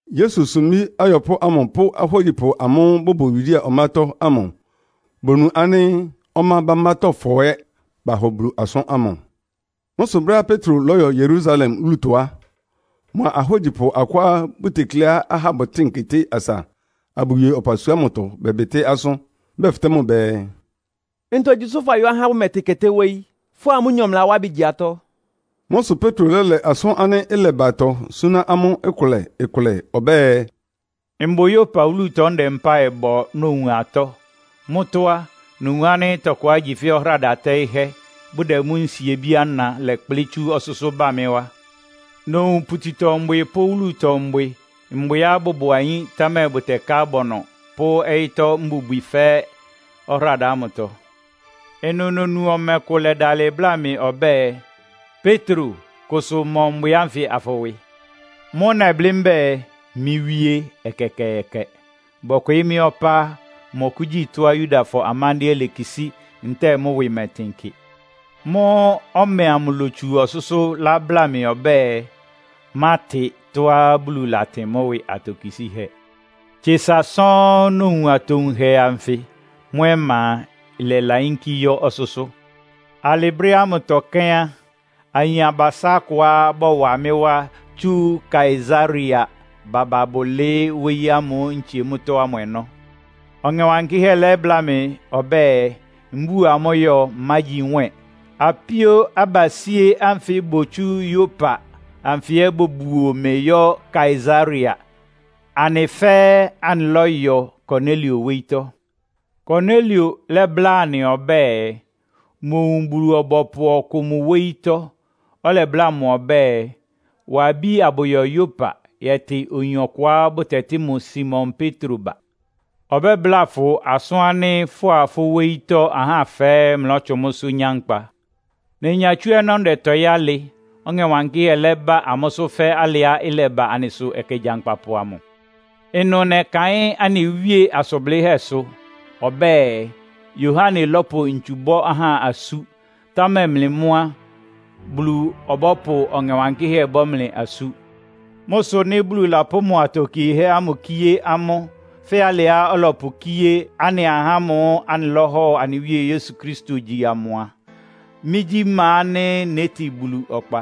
Yesu sumbí ayɔpʋ́ ámʋ pʋ́ ahógyipʋ amʋ́ʋ́ bʋbʋ Yudea ɔmátɔ́ ámʋ bonu ánɩ́ ɔmá bámbátɔ́fɔ ɛ́ bahɔ Bulu asʋ́n ámʋ. Mʋ́ sʋ brɛ́á Petro lɔ́yɔ Yerusalem wúlutɔ á, mʋa ahógyipʋ akʋá bʋtekleá ahá bʋtɩ́ɩn keté asa abʋwie ɔpasua ámʋtɔ bɛbɩtɩ́ asʋ́n. Bɛfɩtɛ́ mʋ bɛɛ, “Ntogyi sʋ fayɔ́ ahá ánɩ́ bʋmɛtɩn keté wóyí, fʋ́a amʋ́nyɔ mlɩlawá ɩbɩ gyi atɔ́?” Mʋ́ sʋ Petro lɛ́lɛ asʋ́n ánɩ́ ɩlɛbatɔ súná amʋ́ ɩkʋlɛ-kʋlɛ ɔbɛ́ɛ, “Mbʋ Yopa wúlutɔ ndɛ mpáɩ bɔ nowun atɔ́. Mʋ́tɔ́ á, nowun ánɩ́ tɔkʋá igyi fɛ́ ɔhráda tɛ́ɩ́hɛ́, bʋdɛ mʋ́ nsiebí ana lɛ́kplɩ́ tsú ɔsʋ́sʋ́ bá mɩ́ wá. Nowun pututɔ-mbwɩ pʋ́ wúlutɔ mbwɩ, mbwɩá bʋbʋ ayín, támɛ bʋtɛká abɔnɔ pʋ́ ɔyɩ́tɔ́ mbubwi fɛ́ɛ́ ɔhráda ámʋtɔ. Ɩnʋ nonu ɔmɛ kʋ lɛdalɩ bláa mɩ ɔbɛ́ɛ, ‘Petro, kʋsʋ mɔ mbwɩ ánfɩ afʋwɩ.’ “Mʋ́ʋ́ nɛblɩ́ mbɛ́ɛ, ‘Mɩ́ Wíe, ɛkɛkɛɛkɛ. Bɔkwɩɩ́ mɩ́ ɔpá á, mmɔkʋ́gyi tɔ́á Yudafɔ amándɩ́ɛ́ lekisí ntɛ́ɛ mʋ́ ɩwɩ mɛtɩn kɩ.’ “Mʋ́ʋ́ ɔmɛ amʋ lótsu ɔsʋ́sʋ́ lábláa mɩ ɔbɛ́ɛ, ‘Mátɩ tɔ́á Bulu latɩn mʋ́ ɩwɩ atokisíhɛ́.’ Tsesa sɔ́ɔ́n nowun atowunhɛ anfɩ. Mʋ́ ɔma a, ɩlɛlayínkí yɔ́ ɔsʋ́sʋ́. “Alɩ brɛ́ ámʋtɔ kɛ́n á, ayin abasá akʋá bɔwa mɩ́ wá tsú Kaesarea baba bʋlɩɩ́ wóyí ámʋ́ʋ́ ntsie mʋ́tɔ́ ámʋ ɔnɔ́. Ɔŋɛ Wankɩ́hɛ́ lɛ́bláa mɩ ɔbɛ́ɛ, mbúo amʋ́ yɔ, mmágyi nwɛ́ɛn. Apíó abasíé ánfɩ botsú Yopa anfɩ ɛ́ bobuo mɩ yɔ́ Kaesarea, anɩ fɛ́ɛ́ anɩlɔ́yɔ Konelio wóyítɔ́. Konelio lɛ́bláa anɩ ɔbɛ́ɛ, mowun Bulu-ɔbɔpʋ ɔkʋ mʋ wóyítɔ́, ɔlɛbláa mʋ ɔbɛ́ɛ, ‘Wa abí abʋyɔ Yopa yɛtɩ oyin ɔkʋá bʋtɛtɩ́ mʋ Simon Petro ba. Ɔbɛ́bláa fʋ asʋ́n ánɩ́ fʋ́a fʋ́ wóyítɔ́ ahá fɛ́ɛ́ mlɔ́tsʋn mʋ́sʋ́ nyá nkpa.’ “Nenya tsú ɔnɔ́ ndɛtɔɩ́ alɩ, Ɔŋɛ Wankɩ́hɛ́ lɛ́ba amʋ́sʋ́ fɛ́ alɩá ɩlɛba anɩsʋ ɛkɛ gyankpapʋ amʋ. Ɩnʋ nɛkaɩ́n anɩ Wíe asʋn blɩ́hɛ́sʋ. Ɔbɛ́ɛ, ‘Yohane lɔ́pʋ ntsu bɔ́ ahá asú. Támɛ mlɩ mʋ́ á, Bulu ɔbɔ́pʋ Ɔŋɛ Wankɩ́hɛ́ bɔ́ mlɩ asú.’ Mʋ́ sʋ nɩ́ Bulu lapʋ́ mʋ atokiehɛ́ ámʋ kíé amʋ́, fɛ́ alɩá ɔlɔpʋkíé anɩ ahá ámʋ́ʋ́ anɩlɔ́hɔ anɩ Wíe Yesu Kristo gyi amʋ a, mɩ́gyí ma ánɩ́ nétin Bulu ɔkpa?”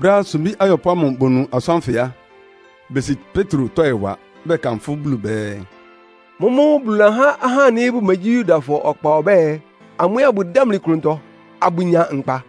Brɛ́á sumbí ayɔpʋ́ ámʋ bonu asʋ́n ánfɩ á, besi Petro tɔ́ɩ wa, bɛkanfʋ́ Bulu bɛɛ, “Mʋ́mʋ́ Bulu lahá ahá ánɩ́ bʋmegyí Yudafɔ ɔkpa ɔbɛ́ɛ, amʋ́ ɛ́ bʋdámli klʋntɔ, abʋnya nkpa.”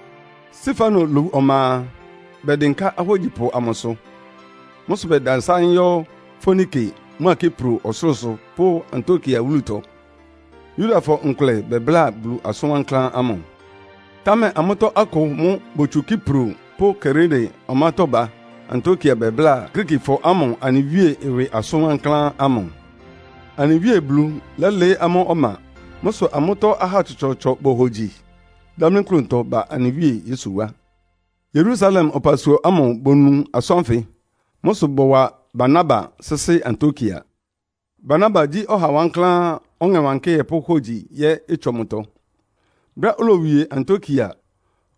Stefano lowu ɔma a, bɛdɩnká ahógyipʋ amʋsʋ. Mʋ́ sʋ bɛdasáɩ́n yɔ́ Foinike mʋ́a Kipro ɔsʋlʋ́sʋ pʋ́ Antiokia wúlutɔ. Yudafɔ nkʋlɛ bɛbláa Bulu asʋn wankláán ámʋ. Támɛ amʋ́tɔ́ akʋ mʋ́ botsu Kipro pʋ́ Kirene ɔmátɔ́ ba Antiokia bɛbláa Griikifɔ ámʋ anɩ Wíe ɩwɩ asʋn wankláán ámʋ. Anɩ Wíe Bulu lɛ́lɩɩ́ amʋ́ ɔma. Mʋ́ sʋ amʋ́tɔ́ ahá tsɔtsɔɔtsɔ bohogyi, dámlí klʋntɔ ba anɩ Wíe Yesu wá. Yerusalem ɔpasua ámʋ bonu asʋ́n ánfɩ. Mʋ́ sʋ bɔwa Barnaba sɩ́sɩ́ Antiokia. Barnaba gyí ɔha wankláán, Ɔŋɛ Wankɩ́hɛ́ pʋ́ hógyi ɛ́ ɩtsɔ mʋtɔ. Brɛ́á olowie Antiokia,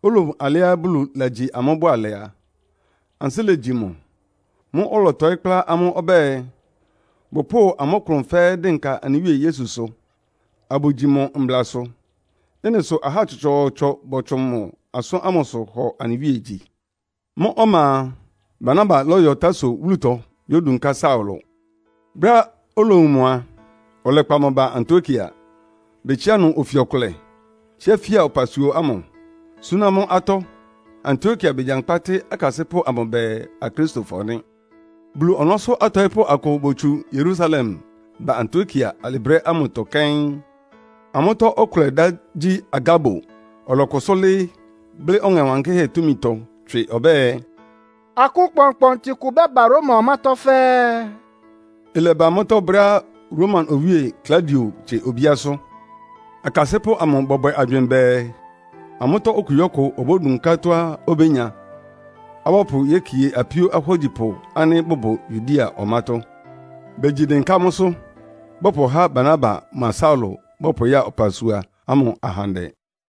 olowun alɩá Bulu lagyi amʋ́ bʋalɛ a, ansɩ́ legyi mʋ. Mʋ́ʋ́ ɔlɔtɔɩ́ kplá amʋ́ ɔbɛ́ɛ, bʋpʋ́ʋ amʋ́ klʋn fɛ́ɛ́ dɩnka anɩ Wíe Yesusʋ, abʋgyi mʋ mblasʋ. Ɩ́nɩ sʋ ahá tsɔtsɔɔtsɔ bɔtsʋn mʋ asʋ́n ámʋsʋ hɔ anɩ Wíe gyi. Mʋ́ ɔma a, Barnaba lɔ́yɔ Tarso wúlutɔ yódunká Saulo. Brɛ́á olowun mʋ a, ɔlɛkpa mʋ ba Antiokia. Betsiá ɩnʋ ofi ɔkʋlɛ, tsíá fía ɔpasua ámʋ, súná amʋ́ atɔ́. Antiokia begyankpá tɩ́ akasɩ́pʋ́ amʋ bɛɛ “Akristofɔ” nɩ́. Bulu ɔnɔ́sʋ́ atɔɩ́pʋ́ akʋ botsu Yerusalem ba Antiokia alɩ brɛ́ ámʋtɔ kɛ́n. Amʋ́tɔ́ ɔkʋlɛ dá gyí Agabo. Ɔlɔkʋsʋ́ lɩ́ɩ́, blɩ́ Ɔŋɛ Wankɩ́hɛ́ túmitɔ tswɩ ɔbɛ́ɛ, “Akʋ́n kpɔnkpɔntɩ kʋ bɛ́ba Roma ɔmátɔ́ fɛ́ɛ́.” Ɩlɛba mʋ́tɔ́ brɛ́á Roma Owíe Klaudio tsie obíásʋ́. Akasɩ́pʋ́ amʋ bɔbwɛ agywɩɩn bɛɛ, amʋ́tɔ́ okugyíɔkʋ obódunká tɔ́á obénya, abʋpʋ yekie apíó ahógyipʋ ánɩ́ bʋbʋ Yudea ɔmátɔ́. Begyi dɩnká mʋ́sʋ́, bɔpʋhá Barnaba mʋa Saulo bɔpʋya ɔpasua ámʋ ahandɛ.